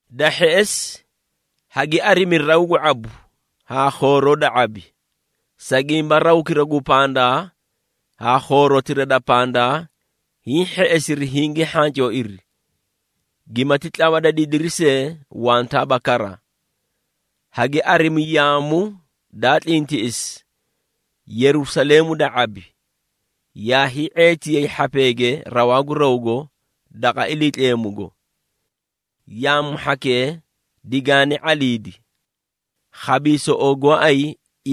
Da hheꞌesi, hagi arimi raw gu ⁄abu haa khooroo da ⁄abi, sa gimba rawkira gu pandaa haa khoorotira da pandaa hiĩ hheꞌesiri hingii hhancooiri, gimati tlawa da didiri see wantaaba kara. Hagi arimi yaamu daa tlintiꞌisi, Yerusaleemu da ⁄abi, yaa hii⁄eetiyay hhapeege rawaa gu rawgo daqa Iliitleemugo. Yaamu hhakee digaani ⁄aliidi, khabiisoꞌoo goóay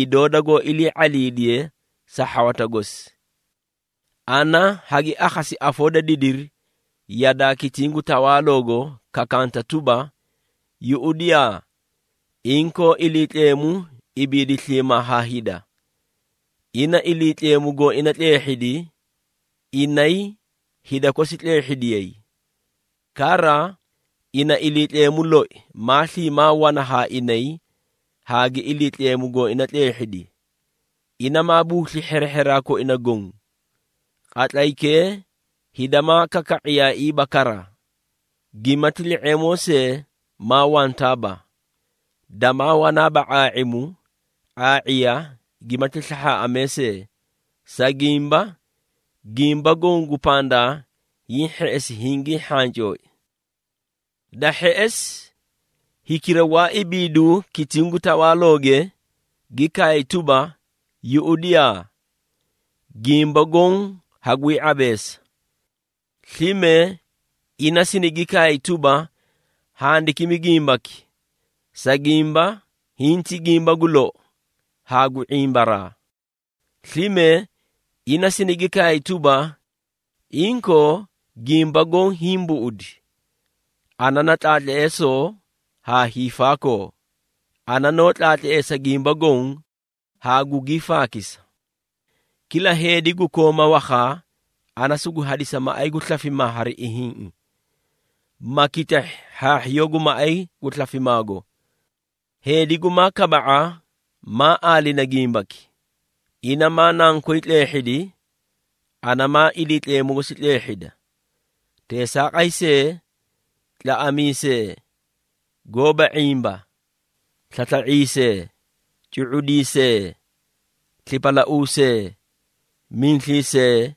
idoo dagoó ilii ⁄aliidiye sa hhawata gosi. Ana hagi akhasi afoo da didiri yadaa kitiĩ gu tawaaloogo kakanta tuba, “Yuꞌudiyaa! Inkoo Iliitleemu ibiidi sliimaa haa hida. Ina Iliitleemu gooina tleehhidi, inay hida kosi tleehhidiyay. Kara, ina Iliitleemu loi maa sliimaa wana haa inay haa gi Iliitleemu gooina tleehhidi. Ina maa buusli hherehheraa koina goõ. Qatlaykee hida maa kaka⁄iyaaiiba kara, gimati li⁄eemoo see maa wantaaba. Damaa wanaaba ⁄aa⁄imu, ⁄aa⁄iya gimati slahhaaꞌamee see, sa gimba, gimba goõ gu pandaa hiĩ hheꞌesi hingii hhancooi.” Da hheꞌesi, hikira gwaa ibiidu kitiĩ gu tawaalooge, gi kaay tuba, “Yuꞌudiyaa! Gimba goõ hagwii ⁄abeesa!” Slime ina sinigi kaay tuba, “Handikimi gimbaki, sa gimba hiĩ ti gimba gu lou haa gu ⁄imbaraa.” Slime, ina sinigi kaay tuba, “Inkoo, gimba goõ hiĩ buꞌudi! Ana na Tlaatleesoo haa Hiifaakoo, ana noó tlaatleesa gimba goõ haa gugii faakisa. Kila heedi gu kooma wakhaa, ana sugu hadisa maꞌay gu slafimaa hari ihiĩꞌi, ma kitahhi hhaahhiyoo gu maꞌay gu slafimaago. Heedi gumaa kaba⁄a maa aalina gimbaki, ina maa nankoy tleehhidi ana maa Iliitleemu gosi tleehhida. Teesaaqay see, tlaꞌamiisee, goóba ⁄imba, slasla⁄iisee, cu⁄udiisee, slipalauusee, miisliisee,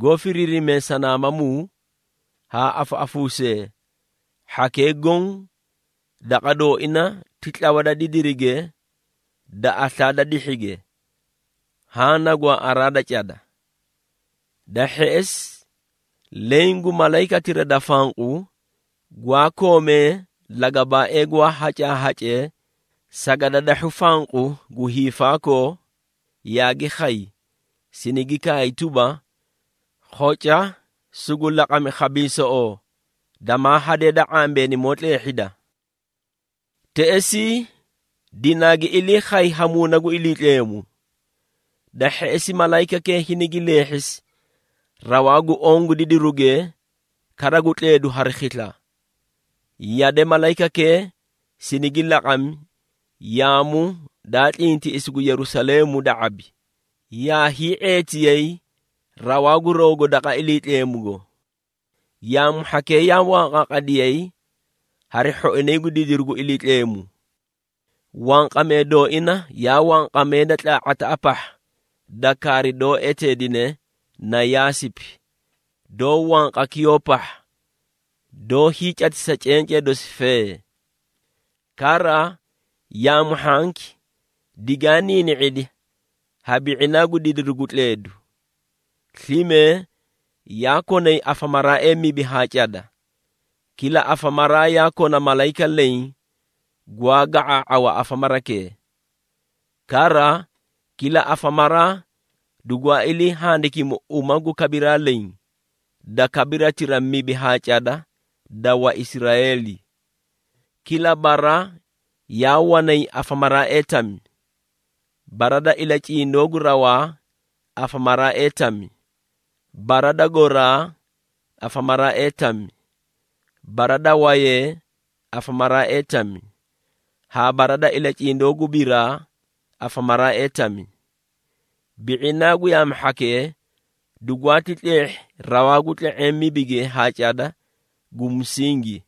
goó firiirimee sanaamamuu, haa afaꞌafuusee, hhakee goõ daqa dooina ti tlawa da didirige da aslaa da dihhige. Haã na gwaaꞌaraa da cada.” Da hheꞌesi, leẽ gu malayikatira da fanqu, gwaa koomee lagabaaee gwaa hacaahacee sagadadahhu fanqu gu hiifaakoo, yaagi khay, sinigi kaay tuba, “Khoca, sugu laqami khabiisoꞌoo, damaa hadee da ⁄ambeenimoo tleehhida.” Teꞌesii, dinaagi ilii khay ha Muuna gu Iliitleemu. Da hheꞌesi, malayikakee hinigi leehhisi rawaa gu oõ gu didiruge kara gu tleedu hari khisla. Yade malayikakee sinigi laqami yaamu daa tlintiꞌisi gu Yerusaleemu da ⁄abi, yaa hii⁄eetiyay rawaa gu rawgo daqa Iliitleemugo. Yaamu hhakee yaa wanqaaqadiyay hari hhoinay gu didiru gu Iliitleemu. Wanqamee dooina yaa wanqamee da tlaa⁄ataꞌa pahha da kaari doó eteedine na yaasipi, doó wanqa kiyoo pahha doó hiicatisa cencee dosi fee. Kara, yaamu hhanki digaa niini⁄idi ha bi⁄inaa gu didiru gu tleedu. Slime, yaa konay afamaraaee mibi haa cada, kila afamaraa yaa kona malayika leẽ gwaa ga⁄aa⁄awa afamarakee. Kara, kila afamaraa dugwaa ilii handikimi uma gu kabiraa leẽ, da kabiratira mibi haa cada da Waisraeeli. Kila bara yaa wanay afamaraaee tami. Bara da ilacindoo gu rawaa afamaraaee tami, bara da gooraa afamaraaee tami, bara da waayee afamaraaee tami, haa bara da ilacindoo gu biraa afamaraaee tami. Bi⁄inaa gu yaamu hhakee, dugwaati tleehhi rawaa gu tle⁄eẽ mibige haa cada gu musingi.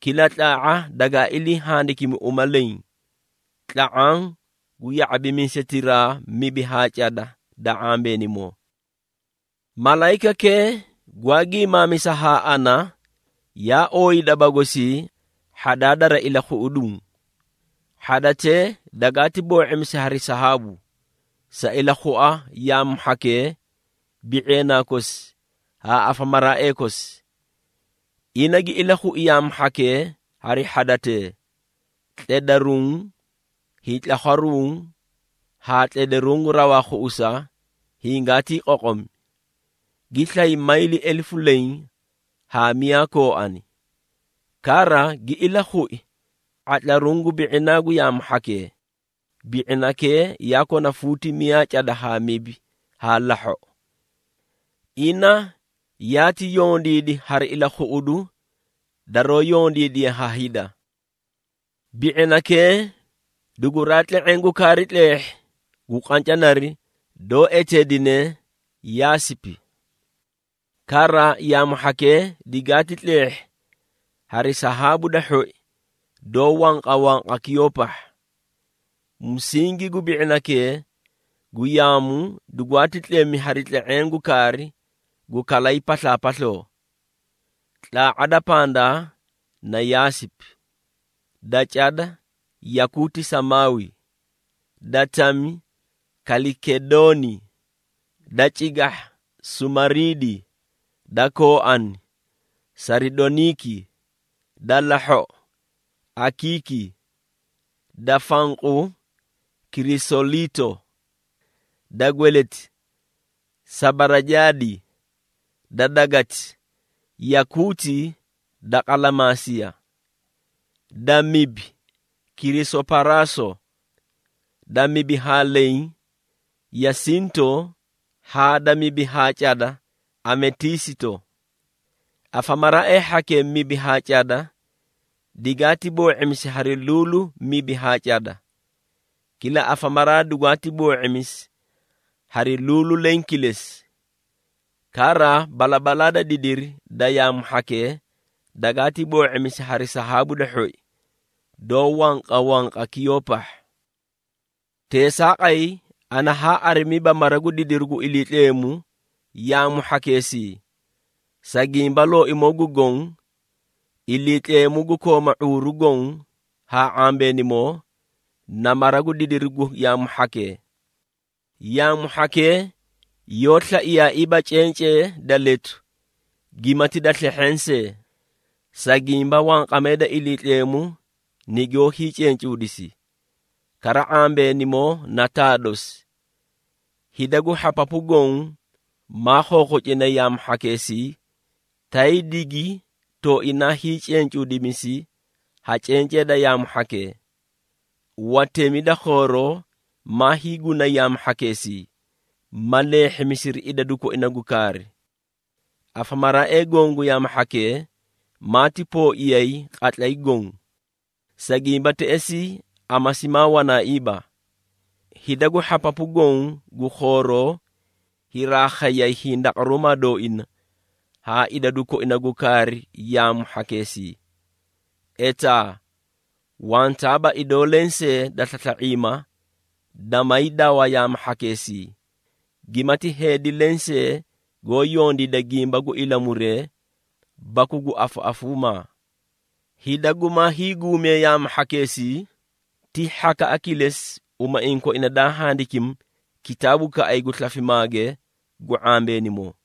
Kila tlaa⁄a dagaa ilii handikimi uma leẽ, tla⁄aã gu ya⁄abimiisetiraa mibi haa cada da ⁄ambeenimoo. Malayikakee gwaa gimaamisa haa ana, yaa ooyi daba gosii hhadaa dari ilakhuꞌuduu. Hhadatee dagaati boo⁄imisi hari sahaabu, sa ilakhua yaamu hhakee, bi⁄eenaa kosi haa afamaraaee kosi. Ina gi ilakhui yaamu hhakee hari hhadatee, tledaruũ, hiitlakhwaruũ haa tledaruũ gu rawaa khuꞌusa hingaatii qoqomi. Gi slay mayli elefu leẽ haa miyaa kooani. Kara, gi ilakhui ⁄atlaruũ gu bi⁄inaa gu yaamu hhakee, bi⁄inakee yaa kona fuuti miyaa cada haa mibi haa lahhoꞌo. Ina yaati yondiidi hari ilakhuꞌudu daroo yondiidiye ha hida. Bi⁄inakee duguraa tle⁄eẽ gu kaari tleehhi gu qancanari doó eteedine yaasipi. Kara, yaamu hhakee digaati tleehhi hari sahaabu da hhoi doó wanqawanqa kiyoo pahha. Musingi gu bi⁄inakee gu yaamu dugwaati tlemi hari tle⁄eẽ gu kaari gu kalay paslaapasloo. Tlaa⁄a da pandaa na yaasipi, da cada yakuuti samaawi, da tami kalikedooni, da cigahha sumariidi, da kooani saridoniiki, da lahhoꞌo akiiki, da fanqu kirisoliito, da dagati sabarajaadi, da gweleti yakuuti da qalamaasiya, da mibi kirisoparaaso, da mibi haa leẽ yasinto haa da mibi haa cada ametiisito. Afamaraaee hhakee mibi haa cada digaati boo⁄imisi hari luulu mibi haa cada. Kila afamaraa dugwaati boo⁄imisi hari luulu leẽ kilesi! Kara balabalaa da didiri da yaamu hhakee dagaati boo⁄imisi hari sahaabu da hhoi, doó wanqawanqa kiyoo pahha. Teesaaqay, ana haa arimiiba Mara gu didiru gu Iliitleemu yaamu hhakeesii, sa gimba Looimoo gu Goõ, Iliitleemu gu kooma ⁄uuru goõ haa ⁄ambeenimoo, na Mara gu didiru gu yaamu hhakee. Yaamu hhakee yoó slaiyaaiiba cencee da letu gimati da slehheẽ see, sa gimba wanqamee da Iliitleemu nigoó hiicencuudisi, kara ⁄ambeenimoo na taa dosi. Hida gu hhapapu goõ maa khokhocinay yaamu hhakeesii, tay digi tooinaa hiicencuudimisi ha cencee da yaamu hhakee. Watemi da khooroo maa hiigunay yaamu hhakeesii, ma leehhimisiri idadu koina gu kaari. Afamaraaee goõ gu yaamu hhakee maati pooiyay qatlay goõ, sa gimba teꞌesii amasi maa wanaaiiba. Hida gu hhapapu goõ gu khooroo hiraa khayay hindaqaruumaa dooina haa idadu koina gu kaari yaamu hhakeesii. Etaa, wantaaba idoo lensee da slasla⁄iima, damaay dawa yaamu hhakeesii, gimati heedi lensee goó yondiida gimba gu ilamuree baku gu afaꞌafuumaa. Hida gumaa hiiguumee yaamu hhakeesii, ti hhakaꞌa kilesi umaiĩ koina daa handikimi kitaabukaꞌay gu slafimaage gu ⁄ambeenimoo.